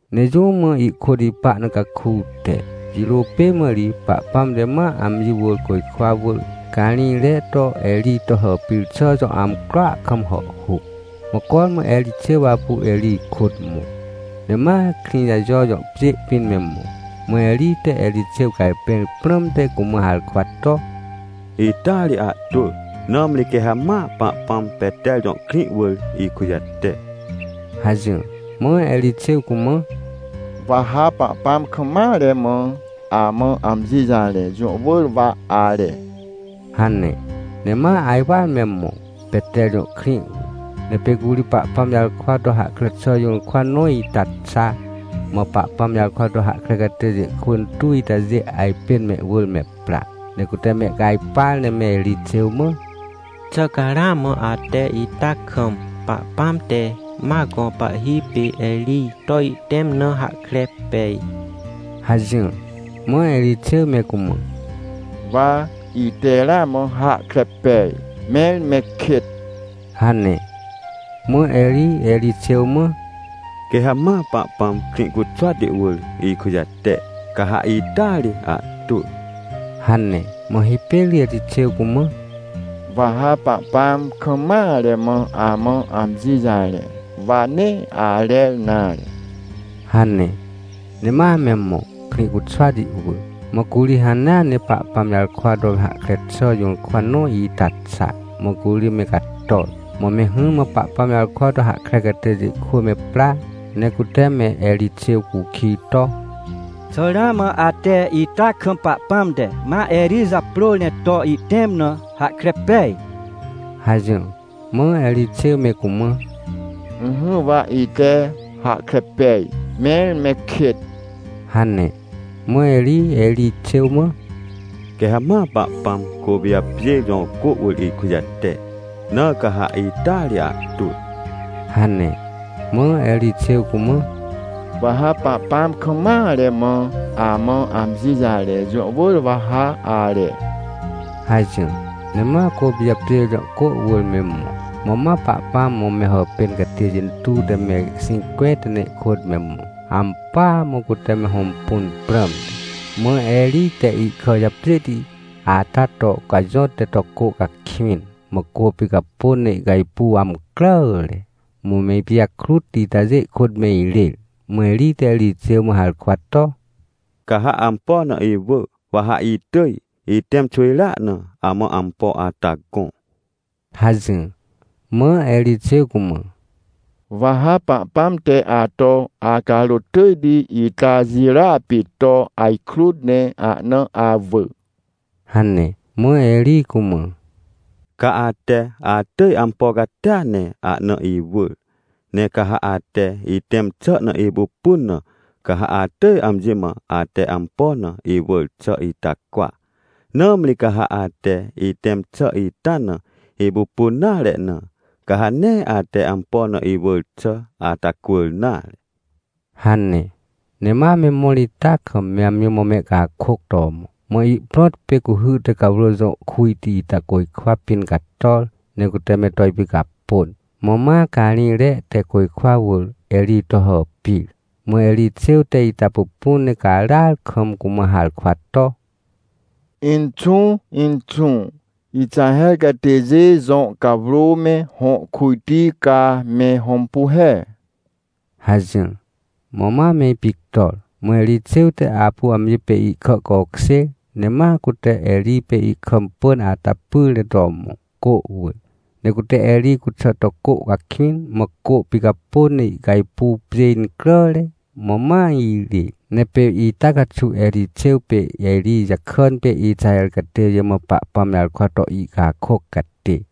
Ne jũ mã ihkôt ipa na caku te, jirô pê mã ri, Pahpãm te ma amji wỳr côjkwa wỳr, carĩjre to Erij to hàpir xà jõ amcroa kam hàhhuc. Mã cormã Erixêw apu Erij kôt mõ. Ne ma Krĩjajojõ pjê pĩn me mõ, mã Erij te Erixêw cajpẽr prãmte cumã harkwa to: — Ita ri ahtwỳ, nãmri quê ha ma Pahpãm Peter jõkrĩ wỳr ikujate — hajỹr. Mã Erixêw cumã: — Wa ha Pahpãm kam mare mã amã amji jarẽ, jũ wỳr wa are — hane. Nema ajwar me mõ, Peter jõ krĩ wỳr. Ne pê curi Pahpãm jarkwa tohahkre xà jũrkwa nõ ita xa. Mã Pahpãm jarkwato hahkre catêjê kwỳ intuwitajê ajpên mehwỳr me pra, ne cute mehcajpar ne me Erixêw mã: — Xà ca ramã ate ita kam, Pahpãm te ma gõ pahhi pê Erij to ihtẽm na, hahkre pej? — hajỹr. Mã Erixêw me cumã: — Wa ite ramã hahkre pej, mẽr me kêt — hane. Mã Erij Erixêw mã: — Quê ha ma Pahpãm Krĩcuxwati wỳr ikujate, ca ha ita ri ahtwỳ — hane. Mã hipêr Erixêw cumã: — Wa ha Pahpãm kam mare mã amã amjijarẽ, wa nee arer nare — hane. Ne ma memõ, Krĩcuxwati wỳr. Mã curi hanea ne Pahpãm jarkwa to hahkre xà jũrkwanõ ita xa, mã curi me cator. Mã me hỹrmã Pahpãm jarkwa to hahkrecatêjê kwỳ me pra, ne cute me Erixêw cukij to: — Xà ramã ate ita kam Pahpãm te ma Erij japrôr ne to ihtẽm na, hahkre pej? — hajỹr. Mã Erixêw me cumã: — Ỹhỹ, wa ite hahkre pej, mẽr me kêt — hane. Mã Erij Erixêw mã: — Quê ha ma Pahpãm Côpijapjêr jõ cô wỳr ikujate, na ca ha ita ri ahtwỳ — hane. Mã Erixêw cumã: — Wa ha Pahpãm kam mare mã amã amji jarẽ, jũ wỳr wa ha are — hajỹr. Ne ma Côpijapjêr jõ cô wỳr me mõ. Mã ma Pahpãm mã me hàpêncatêjê intuw te me xĩncwẽnta ne ihkôt me mõ, ampỳa mã cute me hõmpunprãmte. Mã Erij te ihkà japjêhti ata to cajõt ne to cô cakwĩn, mãcô picapôn ne ihcajpuw amcràare. Mã me ipijakrut itajê ihkôt me irêr. Mã Erij te Erixêw mã harkwa to: — Ca ha ampo na iwỳ, waha itỳj, itẽm xwỳjrea na, amã ampo ata gõ — hajỹr. Mã Erixêw cumã: — Wa ha Pahpãm te ato acarôt tỳjti ita jirôa pê to ajkrut ne ahna awỳ — hane. Mã Erij cumã: — Ca ate atỳj ampo catia ne ahna iwỳr, ne ca ha ate itẽm xà na ipupunna, ca ha atỳj amji mã ate ampo na iwỳr xà ita cwa. Nãmri ca ha ate itẽmxà ita na ipupun nare na, ca ha neeate ampo na iwỳr xà ata cwỳr nare — hane. Ne ma me mõr ita kam, me amji mã mehcakôc to mõ, mã ihprõt pê cuhy tecawrô jõ kujti ita côjkwa pĩn cator, ne cuteme to ipicapôn. Mã ma carĩjre te côjkwa wỳr Erij to hàpir. MãErixêw te ita pupun ne caràar kam cumã harkwa to: — Inxũ, inxũ! Ixaher catêjê jõ cawrô me hõ kujti, ca me hõmpu he! — hajỹr. Mã ma me ipictor. Mã Erixêw te apu amji pê ihkàcokjêr, ne ma cute Erij pê ihkà pỳm ata pyr ne to mõ, cô wỳr. Ne cute Erij cuxà to cô cakwĩn, mã cô picapôn ne ihcajpuw pjê incràre, mã ma irêr. Ne pê ita caxuwErixêw pê Erij jakàn pê Ixaher catêjê mã Pahpãm jarkwa to ihcakôc catê.